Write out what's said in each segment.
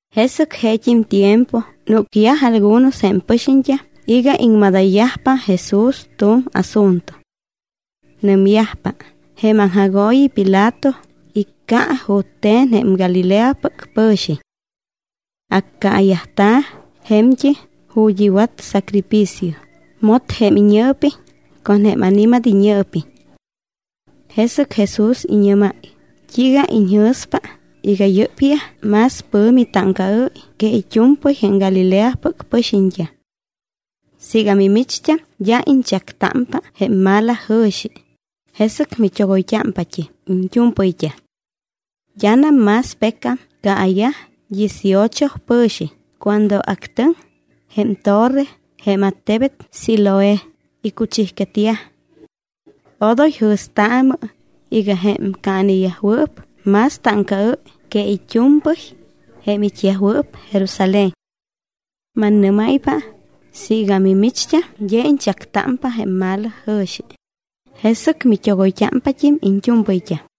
Jesɨc jeet́im tiempo núcyaj algunos jém pɨxiñt́am iga iŋmadayyajpa Jesús tu̱m asunto. Nɨmyajpa: —Jém aŋjagooyi Pilato icca jute̱n jém Galileapɨc pɨ̱xiñ. Accaayajta̱ je̱mt́im ju̱t́ iwat sacrificio, mot jém iñɨɨpiñ con jém ani̱mat iñɨɨpiñ. Jesɨc Jesús iñɨ́máy: —¿T́iiga iñjɨ̱spa iga yɨ́pyaj más pɨ̱mi táŋcaɨ́y que it́u̱mpɨy jém Galileapɨc pɨxiñt́am? Siiga mimicht́am d́a iñchactámpa jém malajɨ̱xi, jesɨc mit́ogoyt́ámpat́im iñt́u̱mpɨyt́am. D́anam más pecam caayaj dieciocho pɨ̱xiñ cuando actɨŋ jém torre jém attebet Siloé, icuchijquetyaj. Odoy jɨ̱staamɨ iga jém caaneyajwɨɨp más táŋcaɨ́y que it́u̱mpɨy jém it́yajwɨɨp Jerusalén. Mannɨ́máypa siiga mimicht́am d́a iñchactámpa jém malajɨ̱xi, jesɨc mit́ogoyt́ámpat́im iñt́u̱mpɨyt́am.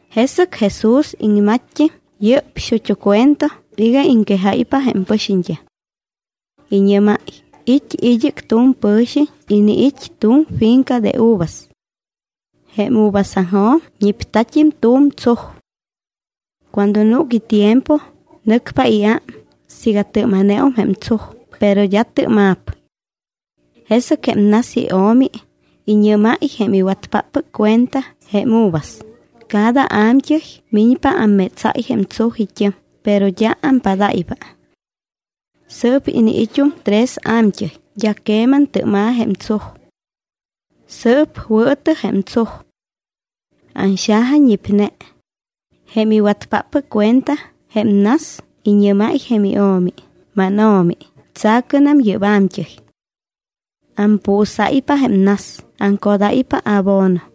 Jesɨc Jesús iŋmatt́im yɨ́p xut́u cuento iga iŋquejáypa jém pɨxiñt́am. Iñɨ́máy: —It́ id́ɨc tu̱m pɨ̱xiñ iniit́ tu̱m finca de uvas. Jém uvasaŋjo̱m ñipta̱t́im tu̱m tsuj. Cuando núc itiempo, nɨcpa iám siiga tɨ́ma̱neum jém tsuj, pero d́a tɨ́ma̱p. Jesɨc jém nas io̱mi iñɨ́máy jém iwatpáppɨc cuenta jém uvas: “Cada a̱mt́ɨy miñpa ammétsáy jém tsuj it́ɨm, pero d́a ampadáypa. Sɨɨp iniit́um tres a̱mt́ɨy, d́a queman tɨ́ma̱ jém tsuj. Sɨɨp wɨɨtɨ jém tsuj. Anxajañipne.” Jém iwatpáppɨc cuenta jém nas iñɨ́máy jém io̱mi: “Máno̱mi, tsa̱cɨnam yɨ́p a̱mt́ɨy. Ampuusáypa jém nas, aŋcodáypa abono.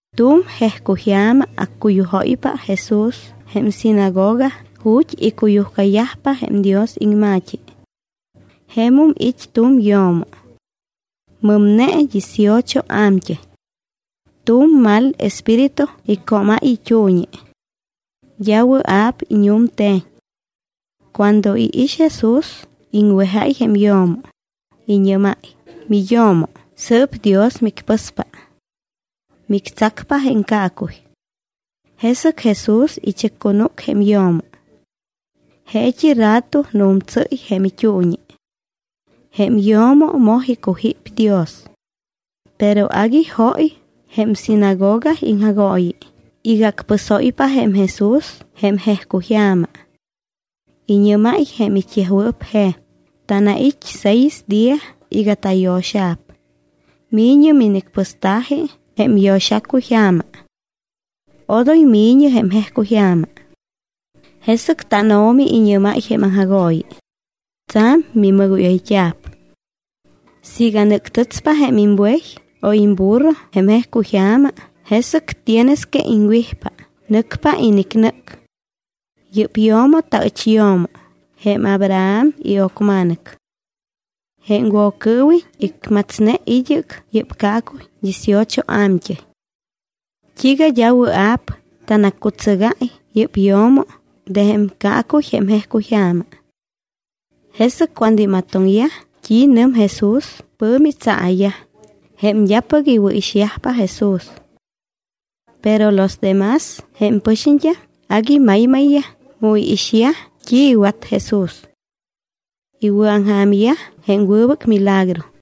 Tu̱m jejcuyja̱ma accuyujóypa Jesús jém sinagoga ju̱t́ icuyujcayajpa jém Dios iŋma̱t́i. Jemum it́ tu̱m yo̱mo. Mɨmne dieciocho a̱mt́ɨy. Tu̱m mal espíritu iccómáy it́uuñi. D́a wɨa̱p iñu̱mte̱ñ. Cuando iix Jesús, iŋwejáy jém yo̱mo. Iñɨ́máy: —Miyo̱mo, sɨɨp Dios micpɨspa. Mictsacpa jém caacuy. Jesɨc Jesús ichɨccunúc jém yo̱mo. Jeet́i rato nu̱mtsɨ́y jém it́uuñi. Jém yo̱mo moj icujíp Dios. Pero agui jóy jém sinagoga iŋjagooyi iga acpɨsóypa jém Jesús jém jejcuyja̱ma. Iñɨ́máy jém it́yajwɨɨp je̱m: —Tanait́ seis día iga tayo̱xa̱p. Mi̱ñɨ minicpɨsta̱ji jém yo̱xacuyja̱ma. Odoy mi̱ñɨ jém jejcuyja̱ma. Jesɨc tánO̱mi iñɨ́máy jém aŋjagooyi: —Tsa̱m minimɨgóyayt́a̱p. Siiga nɨ́ctɨtspa jém imbuey o imburro jém jejcuyja̱ma, jesɨc tienes que iŋwijpa, nɨcpa inicnɨ́c. Yɨ́p yo̱mo taɨch yo̱mo, jém Abraham io̱cma̱nɨc. Jém Woccɨɨwiñ icmatsne id́ɨc yɨ́p caacuy dieciocho a̱mt́ɨy. ¿T́iiga d́a wɨa̱p tanaccutsɨgáy yɨ́p yo̱mo de jém caacuy jém jejcuyja̱ma? Jesɨc cuando imatoŋyaj t́i nɨm Jesús, pɨ̱mi tsaa̱yaj jém d́apɨc iwɨ̱ixyajpa Jesús. Pero los de más jém pɨxiñt́am agui maymayyaj mu iixyaj t́i iwat Jesús. Iwɨ̱aŋja̱myaj jém wɨbɨc milagro.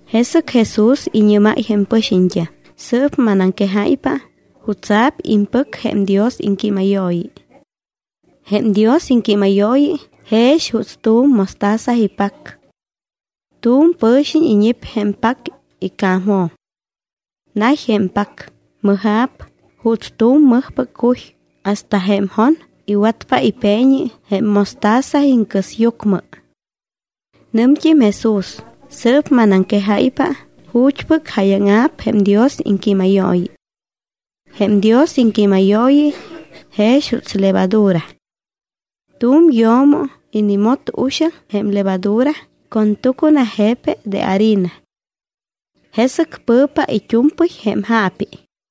Jesɨc Jesús iñɨ́máy jém pɨxiñt́am: —Sɨɨp manaŋquejáypa jutsa̱p iŋpɨc jém Dios iŋquímayooyi. Jém Dios iŋquímayooyi jex juuts tu̱m mostaza ipac. Tu̱m pɨ̱xiñ iñip jém pac ica̱mjo̱m. Nay jém pac, mɨja̱p juuts tu̱m mɨjpɨc cuy hasta jém jon iwatpa ipeeñi jém mostaza iŋcɨsyucmɨ. Nɨmt́im Jesús: —Sɨɨp manaŋquejáypa ju̱t́pɨc jáyaŋa̱p jém Dios iŋquímayooyi. Jém Dios iŋquímayooyi jex juuts levadura. Tu̱m yo̱mo inimot uxaŋ jém levadura con tucuna je̱pe de harina. Jesɨc pɨ̱pa it́u̱mpɨy jém jaapi.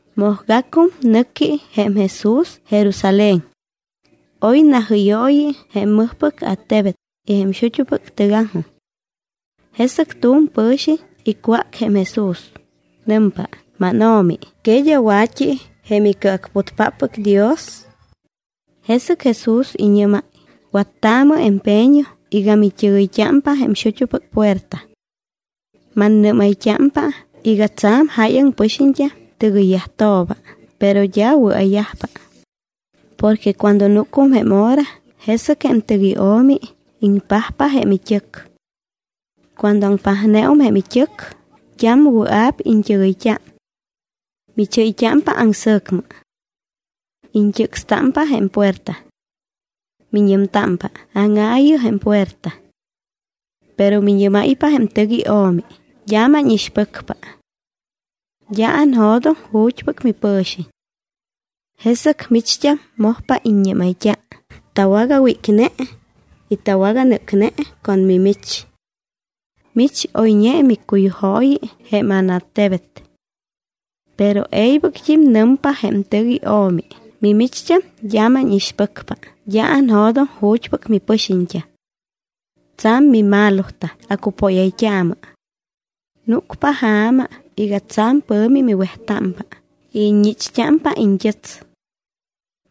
Mojgacum nɨqui jém Jesús Jerusalén. Oy najɨ́yooyi jém mɨjpɨc attebet y jém xut́upɨc tɨgaŋjoj. Jesɨc tu̱m pɨ̱xiñ icwác jém Jesús. Nɨmpa: —MánO̱mi, ¿que d́a wa̱t́i jém icɨacputyajpáppɨc Dios? Jesɨc Jesús iñɨ́máy: —Wattaamɨ empeño iga mit́ɨgɨyt́ámpa jém xut́upɨc puerta. Mannɨ́mayt́ámpa iga tsa̱m jáyaŋ pɨxiñt́am tɨgɨyyajtooba, pero d́a wɨa̱yajpa. ’Porque cuando núcum jém hora, jesɨc jém tɨc io̱mi iŋpajpa jém it́ɨc. Cuando aŋpajneum jém it́ɨc, d́am wɨa̱p iñt́ɨgɨyt́a. Michɨ́yt́ámpa aŋsɨ̱cmɨ. Iñt́ɨcstámpa jém puerta. Miñɨmtámpa: “¡Áŋaayɨ jém puerta!” Pero miñɨ́máypa jém tɨc io̱mi: “D́a mánixpɨcpa. D́a anjo̱doŋ ju̱t́pɨc mipɨ̱xiñ.” Jesɨc micht́am mojpa iññɨ́mayt́a: “Tawagawícne y tawaganɨ́cne con mimich. Mich oyñe miccuyujooyi jém ánattebet.” Pero e̱ybɨct́im nɨmpa jém tɨc io̱mi: “Mimicht́am d́a mánixpɨcpa, d́a anjo̱doŋ ju̱t́pɨc mipɨxiñt́am. Tsa̱m mimalotam, acupóyayt́aamɨ.” Núcpa ja̱ma iga tsa̱m pɨ̱mi miwejtámpa y iññichpa iñt́ɨts.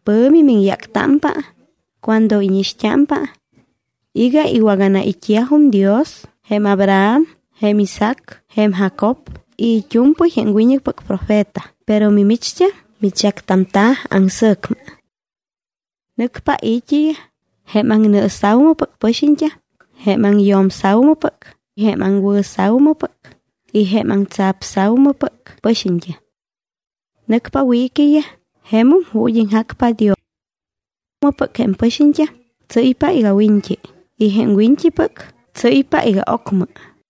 Pɨ̱mi miŋyáctámpa cuando íñixt́ámpa iga iwaganait́yajum Dios jém Abraham, jém Isaac, jém Jacob y it́u̱mpɨy jém wiñɨcpɨc profeta; pero mimicht́am michactamta̱ aŋsɨ̱cmɨ. Nɨcpa i̱t́iyaj jém aŋnɨɨsa̱umɨpɨc pɨxiñt́am, jém aŋyo̱msa̱umɨpɨc, jém aŋwɨ̱xa̱umɨpɨc y jém aŋtsapsa̱umɨpɨc pɨxiñt́am. Nɨcpa wiiquiyaj jemum ju̱t́ iŋjacpa Dios. Jém ocmɨpɨc jém pɨxiñt́am tsɨ́ypa iga wiñt́i y jém wiñt́ipɨc tsɨ́ypa iga ocmɨ.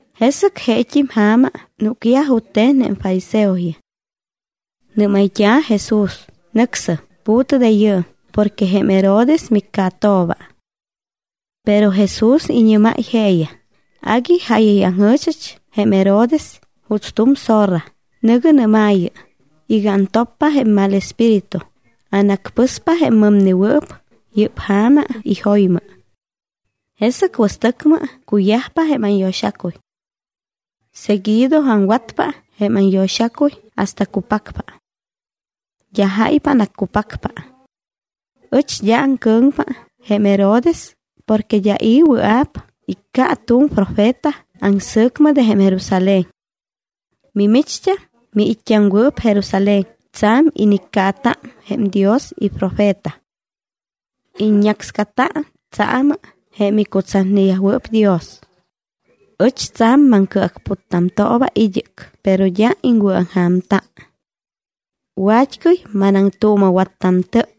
Jesɨc jeet́im ja̱ma núcyaj jute̱n jém fariseoyaj. Nɨ́mayt́a̱ Jesús: —Nɨcsɨm, pu̱tɨ de yɨɨm porque jém Herodes miccaatooba. Pero Jesús iñɨ́máy jeeyaj: —Agui jáyayaŋjɨ̱chɨch jém Herodes juuts tu̱m zorra, nɨ̱gɨ nɨ́maayɨ, iga antoppa jém mal espíritu, anacpɨspa jém mɨmnewɨɨp yɨ́p ja̱ma y jo̱ymɨ. Jesɨc wɨstɨcmɨ cuyajpa jém anyo̱xacuy. Seguido aŋwatpa jém anyo̱xacuy hasta cupacpa. D́a jáypa anaccupacpa. Ɨch d́a aŋcɨ̱ŋpa jém Herodes porque d́a i̱ wɨa̱p icca tu̱m profeta aŋsɨ̱cmɨ de jém Jerusalén. ’Mimicht́am, miit́t́aŋwɨɨp Jerusalén, tsa̱m iniccaata jém Dios iprofeta. Iññácscata tsaamɨ jém icutsatneyajwɨɨp Dios. Ɨch tsa̱m maŋcɨacputtamtooba id́ɨc, pero d́a iŋwɨ̱aŋja̱mta. Wat́cɨy manaŋtuuma̱wattamtɨp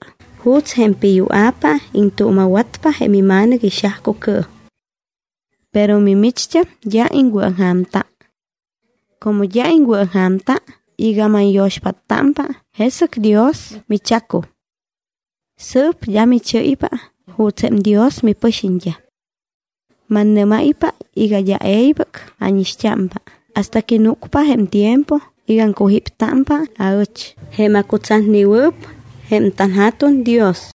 juuts jém piyua̱pa iŋtuuma̱watpa jém ima̱nɨc ixajcucɨɨm. Pero mimicht́am d́a iŋwɨ̱aŋja̱mta. Como d́a iŋwɨ̱aŋja̱mta iga manyo̱xpáttámpa, jesɨc Dios michacum. Sɨɨp d́a michɨ́ypa juuts jém Dios mipɨxiñt́am. Mannɨ́máypa iga d́a e̱ybɨc ánixt́ámpa hasta que núcpa jém tiempo iga aŋcujíptámpa aɨch, jém acutsatnewɨɨp jém tanJa̱tuŋ Dios.